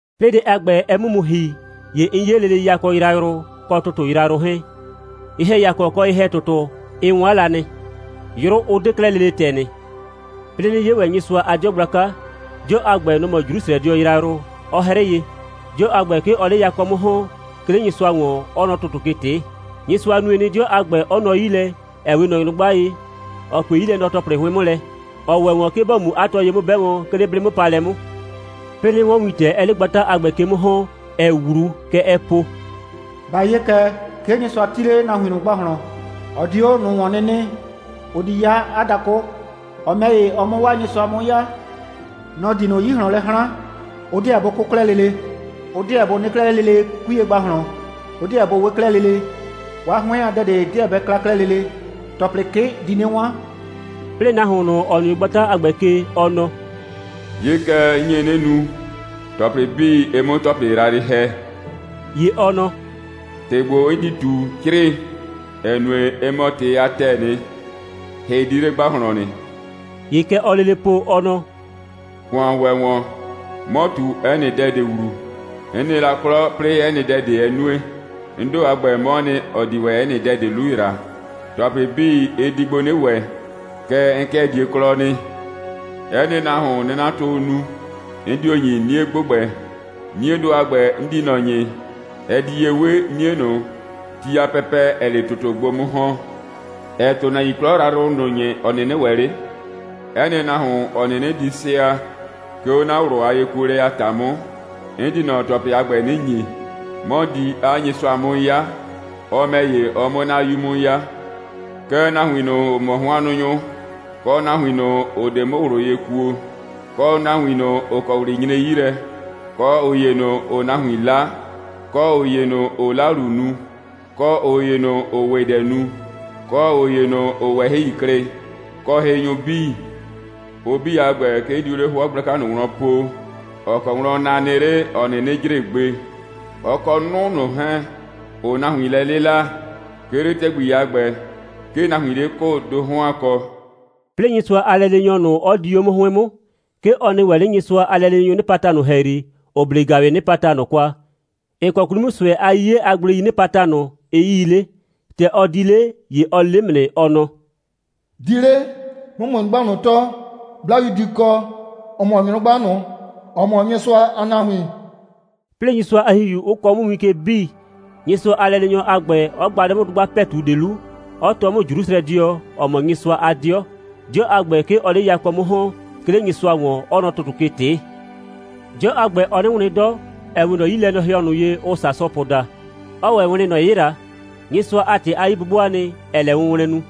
'Plɩɩ dɛ a ‑gbɛ, ɛ 'mʋ mu ‑hi, ‑ye 'n 'ye lele yakɔ yrayrʋ kɔ ‑tʋtʋ yrayrʋ 'hɛɛn. Ye‑hɛyakɔ kɔ ye‑hɛ‑tʋtʋ, ɩ 'wan la nɩ, 'yru 'ʋ 'de 'klɛɛ lele ‑tɛ nɩ. 'Plɩɩ 'nɩ 'ye ‑wɛ Nyɩsʋa a 'dɩɔ gblaka. 'Dɩɔ a ‑gbɛ, nɔ‑ mɔ Jrusrɛdɩɔ yrayrʋ, 'ɔ 'hrɩɩ ye. 'Dɩɔ a ‑gbɛ, 'ke ɔɔ 'le yakɔ 'mʋ ‑hɔn, 'ke 'le Nyɩsʋa ‑wɔn, 'ɔɔ nɔ ‑tʋtʋ ke ꞊tɩɩ. Nyɩsʋa nue nɩ, 'dɩɔ a ‑gbɛ 'ɔ nɔ 'yi lɛ, ‑ɛ 'we ꞊nɔ nyrʋgba ye, ‑ɔ pue 'yilɛnɔ‑tɔplɩ 'hʋɩn 'mʋ lɛ, ‑ɔ ‑wɛ ‑wɔn, 'ke bɔ mu 'a tɔ ye 'mʋ 'bɛ, 'ke 'le 'blɩ'mʋpaalɛ 'mʋ. 'Plɩɩ 'nɩ 'wɔn wintɛ, 'ɛɛ 'le gbata a ‑gbɛ ke 'mʋ ‑hɔn, 'ɛɛ 'wlu. Kɛ ɛɛ po: «Ba 'ye kɛ, 'ke Nyɩsʋa 'ti 'le nahuin ꞊nʋ ‑gbahlɔn. Ɔ di 'o ꞊nʋ ‑wɔn 'nɩ nɩ. Ʋ di 'ya 'a dakʋ, ɔ ‑mɛ ‑ye, ɔ 'mʋ 'waa Nyɩsʋa 'mʋ 'ya. Nɔ‑ di ꞊nʋ 'yi ꞊hlɔn lɛ 'hran. Ʋ 'deɛ bʋ 'kʋ 'klɛɛ lele. Ʋ 'deɛ bʋ nɩ 'klɛɛ 'le lele 'kuiye ‑gbahlɔn. Ʋ 'deɛ bʋ we 'klɛɛ lele. 'Waa 'hʋɩn a dɛ ꞊de 'deɛ bɛ kla 'klɛɛ lele. ‑Tɔplɩ 'kɩ di 'nɩ 'wan.» 'Plɩɩ nahuon ꞊nʋ, ‑ɔ nɩ 'o gbata a ‑gbɛ ke, ɔ nɔ: «'Ye kɛ, 'n nye 'nɩ nu, ‑tɔplɩ 'bii, ɩ 'mʋ ‑tɔplɩ yrayrɩ ‑hɛ.» ‑Ye ɔ nɔ: «‑Tɩ ‑gbo, 'n di ꞊tu, 'crɩɩ, ‑ɛ nue, ɩ mɔ ‑tɩ a ‑tɛɛ nɩ, hɩ 'di 'le ‑gbahlɔn nɩ.» ‑Ye kɛ ɔɔ lele po, ɔ nɔ: «‑Kʋan ‑wɛ ‑wɔn. 'Mɔ ꞊tu 'ɛ nɩ dɛ ꞊de ‑wlu. 'N nɩ la 'klɔ, 'plɩɩ 'ɛ nɩ dɛ ꞊de 'ɛ nue. 'N ‑do a ‑gbɛ, 'mɔɔ nɩ, ‑ɔ di ‑wɛ 'ɛ nɩ dɛ ꞊de 'lu ‑yra. ‑Tɔplɩ 'bii, ɩ di gbo 'nɩ ‑wɛ, kɛɛ, 'n 'kɩɛ die 'klɔ nɩ. 'Ɛ nɩ nahuon, 'nie'natʋʋ nu, 'n dio ‑nyi 'nie ‑gbʋgbɛ. 'Niedʋ a ‑gbɛ, 'n di ꞊nɔ ‑nyi, ɛ di ye 'we 'nie ꞊nʋ, ti a pɛpɛ, ‑ɛɛ 'le ‑tʋtʋ gbo 'mʋ ‑hɔn, ‑ɛɛ ‑tʋnahuin 'klɔ yrayrʋ ꞊nʋ ‑nyi, ‑ɔ 'nɩnɩ ‑wɛ 'le. 'Ɛ nɩ nahuon, ‑ɔ 'nɩnɩ di sɩa, 'ke 'o 'na ꞊wlʋ a yekuolɛ a ‑ta 'mʋ, 'n di ꞊nɔ ‑tɔplɩ a ‑gbɛ 'nɩ ‑nyi. 'Mɔ di 'a Nyɩsʋa 'mʋ 'ya, ɔ ‑mɛ ‑ye, ɔ 'mʋ 'na 'yu 'mʋ 'ya. Kɛɛ, nahuin ꞊nʋ, ‑ʋ mɔ hʋannʋnyʋ, kɔ nahuin ꞊nʋ, ‑ʋ 'de 'mʋ ꞊wlʋ ye kuo, kɔ nahuin ꞊nʋ, ‑ʋ kɔ ꞊wlɩ nyre 'yi lɛ, kɔ ꞊ʋ ‑ye ꞊nʋ, ‑ʋʋ nahuin 'la, kɔ ꞊ʋ ‑ye ꞊nʋ, ‑ʋʋ 'lalu nu, kɔ ꞊ʋ ‑ye ꞊nʋ, ‑ʋʋ ‑wɩdɛ nu, kɔ ꞊ʋ ꞊nʋ, ‑ʋʋ ꞊wɛhɩi klɩ, kɔ hɩnyʋ 'bii, ʋ 'bii a ‑gbɛ, 'ke ʋ diu 'le 'hʋɔ gblaka ꞊nʋ wlɔn po, ‑ɔ kɔ wlɔn na nɩ 'le, ‑ɔ 'nɩnɩ jre gbe, ɔ kɔ 'nʋ ꞊nʋ 'hɛɛn, ‑ʋʋ nahuin lɛ 'lɩla. 'Ke 'le ‑tɛgbi a ‑gbɛ, 'ke nahuiin 'le 'kʋʋ ‑do 'hɔn a kɔ.» 'Plɩɩ Nyɩsʋa a lɛleenyɔ ꞊nʋ, 'ɔ di 'o 'mʋ 'hʋɩn 'mʋ. 'Ke ɔ nɩ wɛn 'le Nyɩsʋa a lɛleenyʋʋ 'nɩpata ꞊nʋ ‑hɛyri, ‑ʋ 'ble ‑gaʋwɩɩ 'nɩpata ꞊nʋ kwa, ‑ɩ kɔ 'kwli 'mʋ ꞊sʋɛ a 'yiye a gbleii 'nɩpata ꞊nʋ, ɩ 'yii 'le. ‑Tɛ ɔ di 'le, ‑ye ɔ le 'mʋ nɩ, ɔ nɔ: «Di 'le, 'mʋ ‑mʋ nyrʋgba ꞊nʋ tɔɔ, 'Blayu di kɔ (‑ɔ mɔ nyrʋgba ꞊nʋ, ‑ɔ mɔ Nyɩsʋa a nahuin).» 'Plɩɩ Nyɩsʋa a ‑Hihiu 'ʋ kɔɔ 'mʋ win ke 'bii, Nyɩsʋa a lɛleenyɔ a ‑gbɛ 'ɔ gba 'le 'mʋ dʋgba ‑pɛtu ꞊de 'lu, 'ɔ tɔɔ 'mʋ Jrusrɛdɩɔ, ‑ɔ mɔ Nyɩsʋa a 'dɩɔ. 'Dɩɔ a ‑gbɛ, 'ke ɔɔ 'le yakɔ 'mʋ ‑hɔn, 'ke 'le Nyɩsʋa ‑wɔn, 'ɔɔ nɔ ‑tʋtʋ ke ꞊tɩɩ. 'Dɩɔ a ‑gbɛ, ɔɔ 'nɩ wlɩn 'dɔ, ‑ɛ 'we ꞊nɔ 'yilɛnɔhɩɔ ꞊nʋ ye, ʋʋ sasʋpʋ daa, 'ɔɔ ‑wɛ wlɩn, ‑nɔ 'yɩla. Nyɩsʋa a ‑tɩ a 'yi'bʋbʋaa nɩ, ‑ɛɛ lɛ wʋnwlɛn nu.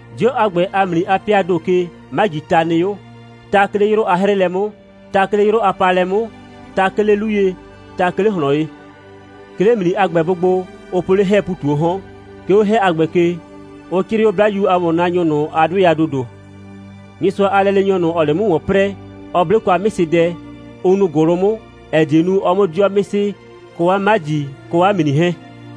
'Dɩɔ a ‑gbɛ a ‑mli a 'pɩaa ‑do ke, 'majii ta nɩ 'o: ta 'ke 'le 'yrʋ a 'hrɩɩlɛ 'mʋ, ta 'ke 'le 'yrʋ a paalɛ 'mʋ, ta 'ke 'le 'lu ye, ta 'ke 'le ꞊hlɔn ye. 'Ke 'le ‑mli a ‑gbɛ bʋ gbo, ʋ po 'le 'hɛɛ ‑pu ꞊tu 'o 'hɔn. 'Ke 'o 'hɛ a ‑gbɛ ke, ʋ 'crɩɩ 'o 'Blayu a ‑wɔnnaanyʋ ꞊nʋ a 'dʋɩ a ‑dodo. Nyɩsʋa a lɛleenyɔ ꞊nʋ, ‑ɔɔ 'le 'mʋ ‑wɔn 'prɛɛ, ɔ 'ble kwa 'mɩsɩdɛ, ʋ nuu ‑gʋlʋ 'mʋ, ‑ɛ die nu, ɔ 'mʋ 'dɩɔ 'mɩsɩ, kɔ 'a 'maji, kɔ 'a ‑mli 'hɛɛn.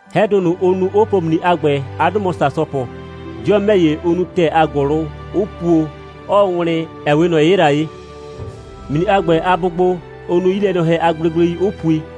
'Hɛdʋ ꞊nʋ, ʋ nu, 'ʋ po ‑mli a ‑gbɛ, 'a 'dʋ mɔ sasʋpʋ. 'Dɩɔ ‑mɛ ‑ye, ʋ nu ‑tɛɛ a ‑gʋlʋ, 'ʋ puo, 'ɔɔ wlɩn, ‑ɛ 'we ꞊nɔ 'yɩla ye. ‑Mli a ‑gbɛ a bʋgbo, ʋ nu 'yilɛnɔhɛ a gblegblei, 'ʋ pui.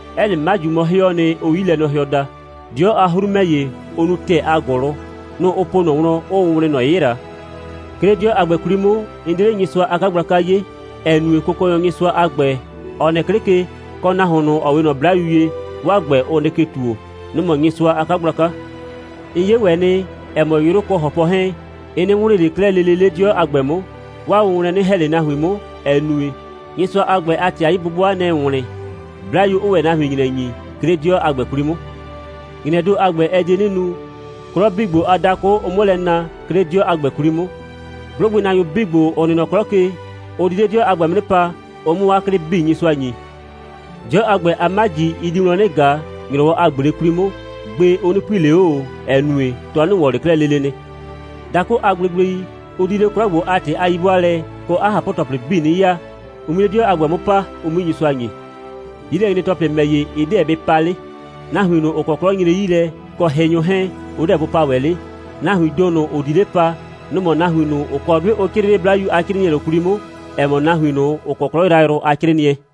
'Ɛ nɩ 'maju mɔ 'hɩɔɔ nɩ, ʋʋ 'yilɛnɔhɩɔ daa. 'Dɩɔ a 'hru ‑mɛ ‑ye, ʋ nu ‑tɛɛ a ‑gʋlʋ. Nʋ‑ ʋ po 'o ꞊nɔ wlɔn, 'ʋʋ wlɩn ‑nɔ 'yɩla. 'Ke 'le 'dɩɔ a ‑gbɛ 'kwli 'mʋ, 'n 'de 'le Nyɩsʋa a 'kagblaka 'ye, ‑ɛ nue, Kʋkɔnyɔ Nyɩsʋa a ‑gbɛ, ‑ɔ nɩ 'klɩ ke, kɔ Nahuon ꞊nʋ, ‑ɔ 'we ꞊nɔ 'blayu ye, 'waa ‑gbɛ, ʋ nɩ ke ‑tuo. Nʋ‑ mɔ Nyɩsʋa a 'kagblaka. 'N 'ye ‑wɛ nɩ, ‑ɛ mɔ, 'yrʋ kɔ ‑hɔpʋ 'hɛɛn, ɩ 'nɩ wlɩɩn ꞊le 'klɛɛ lele 'le 'dɩɔ a ‑gbɛ 'mʋ. 'Waa wʋnwlɛn 'nɩ ‑hɛ ꞊le nahuin 'mʋ, ‑ɛ nue, Nyɩsʋa a ‑gbɛ a ‑tɩ a 'yi'bʋbʋa, nɛ‑ɛ wlɩn, 'Blayu 'ʋʋ ‑wɛ nahuin ‑nyrɛ ‑nyi, 'ke 'le 'dɩɔ a ‑gbɛ 'kwli 'mʋ. ‑Nyrɛɛ ‑do a ‑gbɛ, ɛ die 'nɩ nu, 'klɔ 'bii ‑gbo a dakʋ, ʋ 'mʋ lɛ na, 'ke 'le 'dɩɔ a ‑gbɛ 'kwli 'mʋ. 'Blʋgbɩnaanyʋ 'bii ‑gbo, ‑ʋ nɩ nɔ 'klɔ ke, ʋ di 'le 'dɩɔ a ‑gbɛ 'mʋ 'nɩ pa, ʋ 'mʋ 'waa 'klɩ 'bii Nyɩsʋa ‑nyi. 'Dɩɔ a ‑gbɛ a 'maji, ɩ di wlɔn lɛ 'nɩ ꞊ga, ‑nyrɔwɔ a ꞊gble 'kwli 'mʋ. Gbe, ʋ 'nɩ pui ꞊le 'o ꞊o, ‑ɛ nue, 'tɔ 'nɩ ‑wɔn ꞊le 'klɛɛ lele nɩ. Dakʋ a gblegblei, ʋ di 'le 'klɔ ‑gbo a ‑tɩ a 'yi'bʋaalɛ kɔ 'a ꞊hapʋ‑tɔplɩ 'bii 'nɩ ya, ʋ 'mui 'le 'dɩɔ a ‑gbɛ 'mʋ paa, ʋ 'mui Nyɩsʋa ‑nyi. 'Yilɛnyre‑tɔplɩ ‑mɛ ‑ye, ɩ 'deɛ bɩ pa 'le. Nahuin ꞊nʋ, ‑ʋ kɔ ꞊wlɩ nyre 'yi lɛ, kɔ hɩnyʋ 'hɛɛn, ʋ 'deɛ bʋ pa ‑wɛ 'le. Nahuiin ‑do ꞊nʋ, ‑ʋ di 'le pa, nʋ‑ mɔ nahuin ꞊nʋ, ‑ʋ kɔ 'dʋɩ ʋ 'crɩɩ 'le 'Blayu a 'crɩɩnɩɛ ꞊nʋ 'kwli 'mʋ, ‑ɛ mɔ nahuin ꞊nʋ, ‑ʋ kɔ 'klɔ yrayrʋ a 'crɩɩnɩɛ.